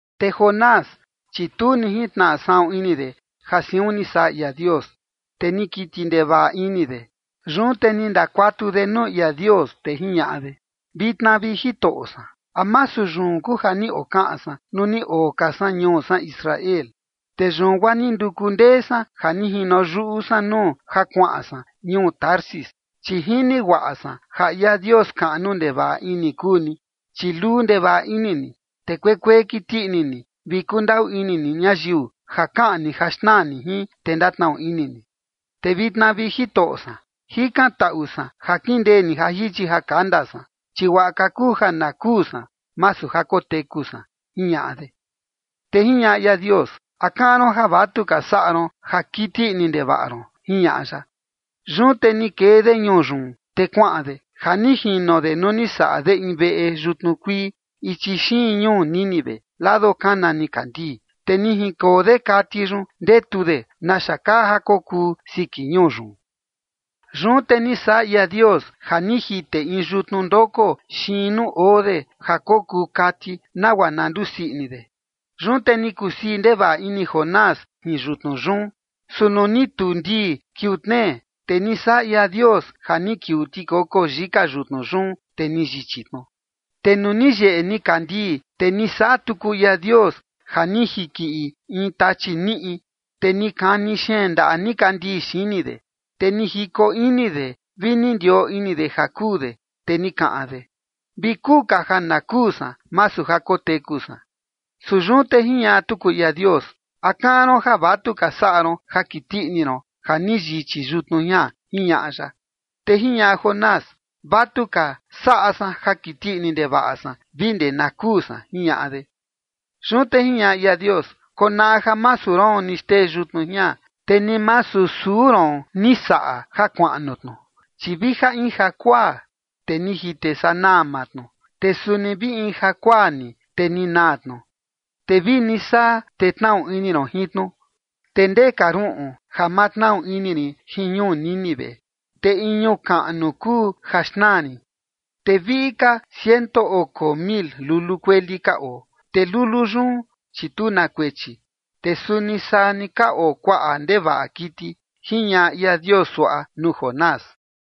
Te Jonás, chi tu ni jintnaꞌa saꞌun ini de ja siun ni saꞌa ia Dios, te ni kiti ndevaꞌa ini de. Yun te ni ndakuatu de nuu ia Dios, te jiñaꞌa de: ―Vitna, vi Jitoꞌo san, ¿a masu yun kuu ja ni okaꞌan san nuu ni oo ka san ñuu san Israel? Te yun guaa ni nduku ndee san ja ni jino yuꞌu san nuu ja kuaꞌan san ñuu Tarsis, chi jini guaꞌa san ja ia Dios kaꞌnu ndevaꞌa ini kuu ni, chi luu ndevaꞌa ini ni, te kuekuee kiti ini ni, vi kundaꞌu ini ni ñayiu ja kaꞌan ni ja xnaa ni jin, te ndatnaꞌu ini ni. Te vitna, vi Jitoꞌo san, jikantaꞌu san ja kindee ni ja jichi ja kanda san, chi guaꞌa ka kuu ja na kuu san, masu ja koteku san ―jiñaꞌa de. Te jiñaꞌa ia Dios: ―¿A kaꞌan ron ja vatuka saꞌa ron ja kiti ini ndevaꞌa ron? ―jiñaꞌa ya. Yun te ni kee de ñuu yun, te kuaꞌan de ja ni jino de nuu ni saꞌa de in veꞌe yutnu kuii, ichi xiin ñuu Nínive, lado kana nikandii, te ni jinkoo de kati yun, ndetu de naxa kaa ja kokuu siki ñuu yun. Yun te ni saꞌa ia Dios ja ni jite in yutnu ndoko xiin nuu oo de ja kokuu kati, nagua na ndusii ini de. Yun te ni kusii ndevaꞌa ini Jonás jin yutnu yun. Su nuu ni tuu ndii kiuu tnee, te ni saꞌa ia Dios ja ni kiuu tikoko yika yutnu yun, te ni yichi tnu. Te nuu ni yeꞌe nikandii, te ni saꞌa tuku ia Dios ja ni jinkiꞌi in tachi niꞌi, te ni kani xeen ndaꞌa nikandii xini de, te ni jiko ini de, vi ni ndioo ini de ja kuu de. Te ni kaꞌan de: ―Vi kuu ka ja na kuu san, masu ja koteku san. Su yun te jiñaꞌa tuku ia Dios: ―¿A kaꞌan ron ja vatuka saꞌa ron ja kiti ini ron ja ni yichi yutnu jian? ―jiñaꞌa ya. Te jiñaꞌa Jonás: ―Vatuka saꞌa san ja kiti ini ndevaꞌa san vi ndee nuu na kuu san ―jiñaꞌa de. Yun te jiñaꞌa ia Dios: ―Konaꞌa ja masu roon ni xtee yutnu jian, te ni masu suu roon ni saꞌa ja kuaꞌnu tnu. Chi vija in jakuaa, te ni jite sanaa maa tnu, te suni vi in jakuaa ni te ni naa tnu. Te vini saa, te tnaꞌu ini ron jin tnu. Te ndee ka ruꞌun ja ma tnaꞌu ini rin jin ñuu Nínive, te in ñuu kaꞌnu kuu ja xnaa rin, te viꞌi ka ciento oko mil lulu kueli ka oo, te lulu yun, chi tu na kuechi. Te suni saa ni ka oo kuaꞌa ndevaꞌa kiti ―jiñaꞌa ia Dios suaꞌa nuu Jonás.